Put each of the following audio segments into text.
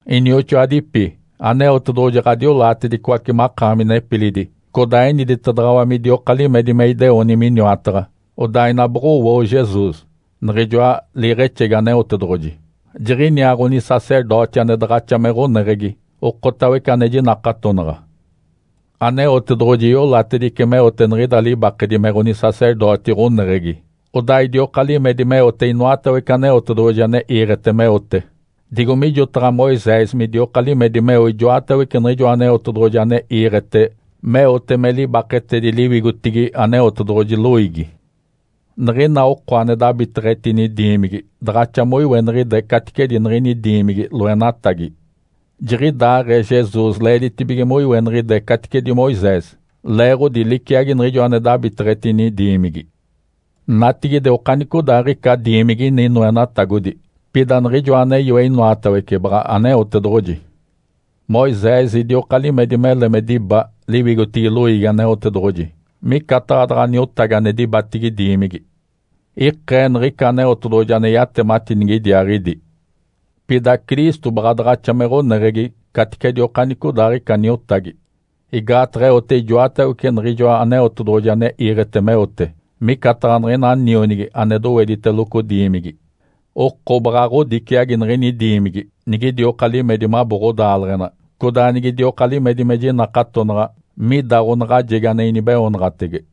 Inioxoadipi, Aneotedoɡ̶oji ɡ̶adiolaatedicoace makaami nepilidi, codaa eniditedaɡ̶awa midioka limedi me ideoni miniwataɡ̶a, odaa ina boɡ̶owoo Jesus, Niɡ̶ijoa liiɡ̶exegi Aneotedoɡ̶oji, jiɡ̶iniaa ɡ̶onisacerdoti ane daɡ̶axa me ɡ̶oneɡ̶egi, okotawece ane jinakatonaɡ̶a. Aneotedoɡ̶oji iolatedice meote niɡ̶ida libakedi me ɡ̶onisacerdoti ɡ̶oneɡ̶egi, odaa idioka limedi meote inoatawece Aneotedoɡ̶oji ane iiɡ̶ete meote, digo mijotaɡ̶a Moisés midioka limedi meo ijoatawece niɡ̶ijoa Aneotedoɡ̶oji ane iiɡ̶ete meote me libaketedi liwigotigi Aneotedoɡ̶oji loiigi. Niɡ̶ina oko ane dabiteɡ̶etini diimigi daɡ̶axa moiweniɡ̶ide caticedi niɡ̶ini diimigi loenatagi. Jiɡ̶idaaɡ̶ee Jesus leeditibige moiweniɡ̶ide caticedi Moisés, leeɡ̶odi liciagi niɡ̶ijo ane dabiteɡ̶etini diimigi. Natigide okanicodaaɡ̶ica diimigi ini noenatagodi, pida Niɡ̶ijoa ane yoe inoatawece baɡ̶a Aneotedoɡ̶oji. Moisés idioka limedi mele me diba liwigotigi loiigi Aneotedoɡ̶oji, micataɡ̶a daɡ̶a niotagi ane dibatigi diimigi. Ikee niɡ̶ica Aneotedoɡ̶oji ane yatemati nigidiaaɡ̶idi. Pida Cristo baɡ̶a daɡ̶axa me ɡ̶oneɡ̶egi caticedi okanicodaaɡ̶ica niotagi. Igaataɡ̶a eote ijoatawece niɡ̶ijoa Aneotedoɡ̶oji ane iiɡ̶ete meote, micataɡ̶a niɡ̶ina nionigi ane dowediteloco diimigi. Oko baɡ̶a ɡ̶odiciagi niɡ̶ini diimigi, nigidioka limedi mabo ɡ̶odaaleɡ̶ena, codaa nigidioka limedi me jinakatonaɡ̶a mida ɡ̶onaɡ̶ajegi ane inibeoonaɡ̶atege.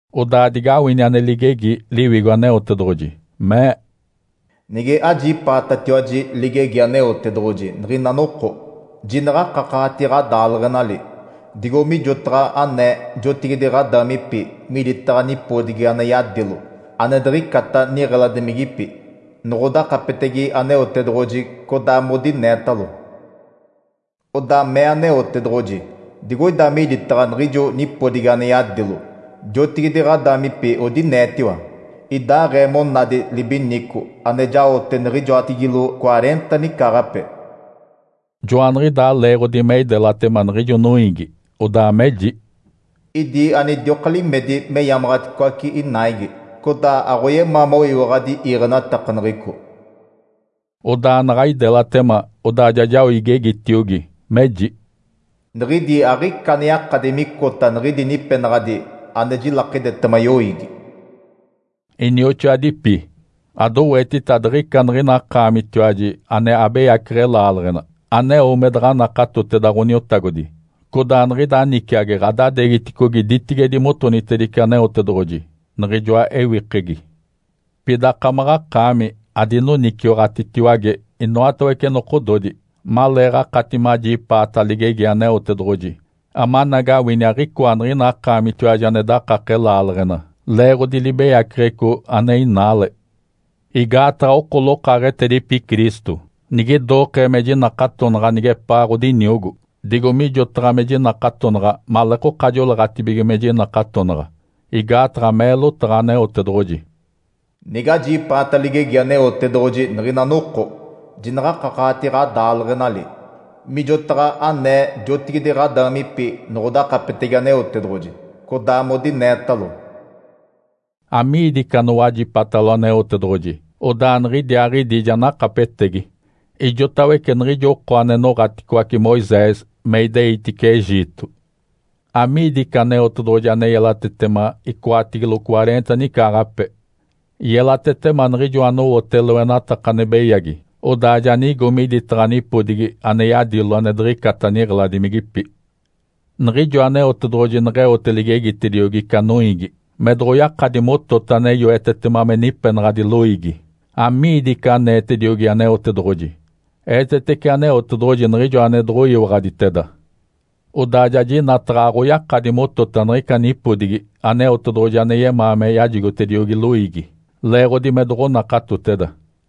Odaa digawini ane ligegi Liwigo Aneotedoɡ̶oji, mee, “Nige ajipaatatiwaji ligegi Aneotedoɡ̶oji niɡ̶ina noko, jinaɡ̶a akakaɡ̶ati ɡ̶adaaleɡ̶enali, digo mijotaɡ̶a anee jotigide ɡ̶adaamipi miditaɡ̶a nipodigi ane yadilo ane diɡ̶icata niɡ̶eladimigipi, noɡ̶odakapetege Aneotedoɡ̶oji, codaa modineetalo.” “Odaa mee Aneotedoɡ̶oji, ‘Digoida miditaɡ̶a niɡ̶ijo nipodigi ane yadilo, jotigide ɡ̶adaamipi odineetiwa, idaaɡ̶ee monadi libinico ane jaote niɡ̶ijoatigilo cwareenta nicaaɡ̶ape. Joaniɡ̶idaa leeɡ̶odi me idelatema niɡ̶ijo noiigi, odaa meji, “Idi anidioka limedi meyamaɡ̶aticoace inaigi codaa aɡ̶oyemaa moyiwaɡ̶adi iiɡ̶enatakaneɡ̶eco.” Odaa naɡ̶a idelatema odaa ja jao igegitiogi meji, “Niɡ̶idi aɡ̶ica ane yakadi micota niɡ̶idi nipenaɡ̶adi ane jilakidetema yoiigi.”’” Inioxoadipi, adowetita adiɡ̶ica niɡ̶ina akaamitiwaji ane abeyaceɡ̶e laaleɡ̶ena aneo me daɡ̶a nakatoteda Ǥoniotagodi, codaa niɡ̶ida niciagi ɡ̶adadeegiticogi ditigedi motonitedice Aneotedoɡ̶oji, Niɡ̶ijoa ewikegi. Pida akamaɡ̶akaami adinoniciwaɡ̶atitiwage inoatawece nokododi maleeɡ̶akati majipaata ligegi Aneotedoɡ̶oji, amanagawini aɡ̶icoa niɡ̶ina akaamitiwaji ane dakake laaleɡ̶ena, leeɡ̶odi libeyaceɡ̶eco ane inaale. Igaataɡ̶a oko lokaaɡ̶etedipi Cristo nige idokee me jinakatonaɡ̶a nigepaa ɡ̶odiniogo, digo mijotaɡ̶a me jinakatonaɡ̶a maleekoka joleeɡ̶atibige me jinakatonaɡ̶a. Igaataɡ̶a mee lotaɡ̶a Aneotedoɡ̶oji, “Nigajipaata ligegi Aneotedoɡ̶oji niɡ̶ina noko, jinaɡ̶akakaɡ̶ati ɡ̶adaaleɡ̶enali, mijotaɡ̶a anee jotigide ɡ̶adaamipi noɡ̶odakapetege Aneotedoɡ̶oji, codaa modineetalo.” Amiidi ica anowajipatalo Aneotedoɡ̶oji odaa niɡ̶idiaaɡ̶idi ja nakapetegi? Ijotawece niɡ̶ijo oko ane noɡ̶aticoace Moisés me ideitice Egito. Amiidi ica Aneotedoɡ̶oji ane yelatetema icoatigilo cwareenta nicaaɡ̶ape? Yelatetema niɡ̶ijo anowote loenataka ane beyagi odaa ja nigo miditaɡ̶a nipodigi ane yadilo ane diɡ̶icata niɡ̶eladimigipi. Niɡ̶ijo Aneotedoɡ̶oji neɡ̶eote ligegitediogi ica noiigi me doɡ̶oyakadi motota ane yoetetema me nipenaɡ̶adi loiigi, amiidi ica aneetediogi Aneotedoɡ̶oji? Eetetece Aneotedoɡ̶oji niɡ̶ijo ane doɡ̶oyiwaɡ̶aditeda. Odaa ja jinataɡ̶a aɡ̶oyakadi motota niɡ̶ica nipodigi Aneotedoɡ̶oji ane yemaa me yajigotediogi loiigi, leeɡ̶odi me doɡ̶onakatoteda.